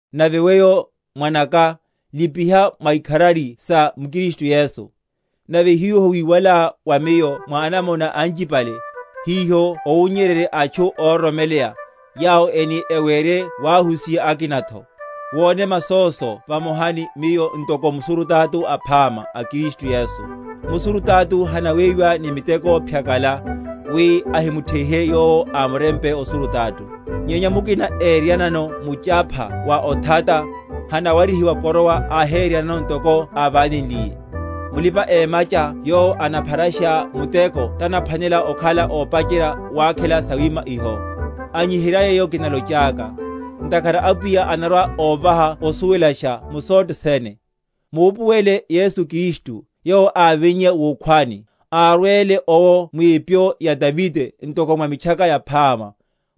Nave weyo, mwanaka, lipiha mwikharari sa m’Kristu Yesu. Nave hiho wíwalá wa miyo mwa anamona anchipale, hiho owunnyererye atchu óroromeleya, yawo eni ewerye wahusiha akinatho. Wone masóso vamoha ni miyo ntoko musurutato aphama a Kristu Yesu. Musurutato hanaweyiwa ni miteko phyakala, wi ahimutheihe yowo ámurempe osurutato. Nyenya mukina éryeryanano muchapha wa othata, hanawarihiwa koroa áhéreryanano ntoko ávánenliye. Mulipa‐emacha yowo anapharasha muteko tanaphwanela okhala ópacherya wakhela sawima iho. Anyiherya yeyo kinalochaka; ntakhara Apwiya anarwa‐óvaha osuwelasha mu sothe sene. Mupuwele Yesu Kristu, yowo ávinnye wukhwani, árwele owo mwipyo ya Davide, ntoko mwa Mitchaka Yaphama;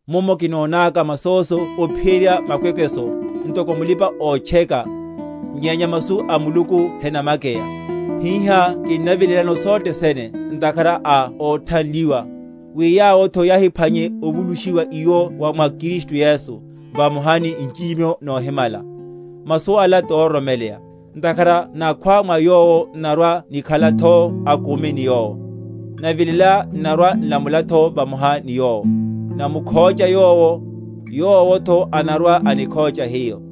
mummo kinonaka masóso ophiyerya makwekweso, ntoko mulipa‐otcheka; nyenya masu a Muluku henamakeya. Hihá kinnavilelano sothe sene, ntakhara a óthanliwa, wi yawotho yahiphwanye ovulushiwa iwo wa mwa Kristu Yesu, vamoha ni nchichimiho nohimala. Masu ala tororomeleya: ntakhara nakhwa mwa Yowo, n’narwa‐nikhalatho akumi ni Yowo: navilela, n’narwa‐nlamulatho vamoha ni Yowo: namukhócha Yowo, Yowotho anarwa‐anikhócha hiyo: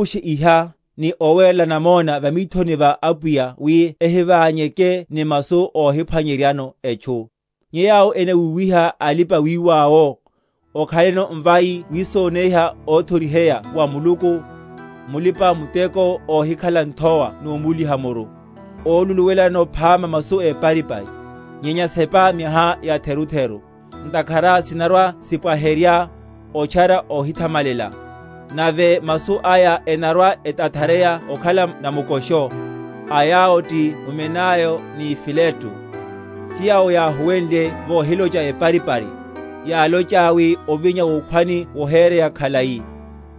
Owupushe iha, ni owerela namona va mithoni va Apwiya, wi ehiványeke ni masu óhiphwanyeryano etchu, nyenya yawo enawuwiha alipa‐wiwa’wo. Okhaleno mvai wisoneiha óthoriheya wa Muluku, mulipa‐muteko óhikhalano nthowa nomúliha muru, óluluwelano phama masu éparipari. Nyenya sepa miaha yatherutheru; ntakhara sinarwa‐sipwaherya otchara ohithamalela, nave masu aya enarwa?-?etathareya okhala namukosho; a yawo ti Humenayo ni Fileto; ti yawo yáhuwenle vohilocha eparipari, yálochaya wi ovinya wukhwani wohereya khalai,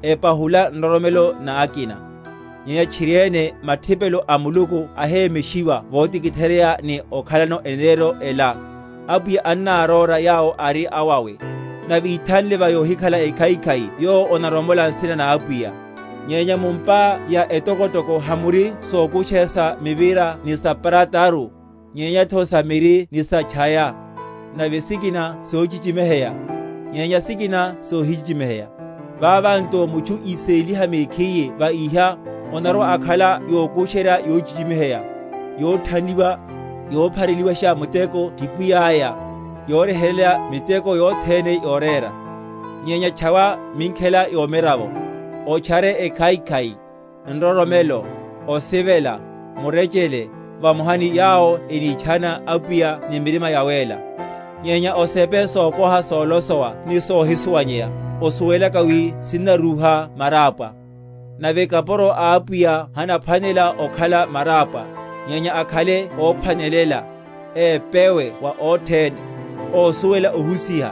epahula nroromelo na akina. Nyenya tchiriene mathipelo a Muluku ahemeshiwa votikitheryeya, ni okhalano eneneryo ela, Apwiya annáróra yawo ari awawe; nave, Ithanle va yohikhala ekhaikhai yowo onaromola nsina na Apwiya. Nyenya mu’mpa etokotoko hamuri sokusherya sa mivira ni sa prataru, nyenyatho sa miri ni sa’tchaya; nave sikina sochichimiheya, nyenya sikina sohichichimiheya. Vava nto mutchu íséliha mekhiye va iha, onarwa‐akhala yokusherya yochichimiheya, yothanliwa, yophareli?-?washa muteko ti pwiyáya, yoryeheryela miteko yothene yorera. Nyenya tchawa minkhela yomiravo, otchare ekhaikhai, nroromelo, osivela, murechele, vamoha ni yawo enítchana Apwiya ni mirima yawéla. Nyenya osepe sokoha solosowa ni sohisuwanyeya, osuwelaka wi sinnarúha marápwa. Nave kapuro a Apwiya hanaphwanela okhala marápwa, nyenya akhale óphwanelela, épewe wa othene, ósuwela ohusiha,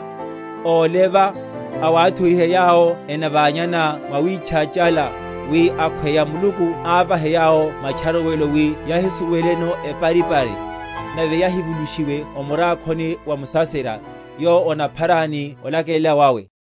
óleva, awathoriherya yawo enaványana mwawitchachala; wi akhweya Muluku ávahe yawo matcharuwelo wi yahisuweleno eparipari, nave yahívulushe o murakhoni wa musaserya, yowo onaphara ni olakelela wawe.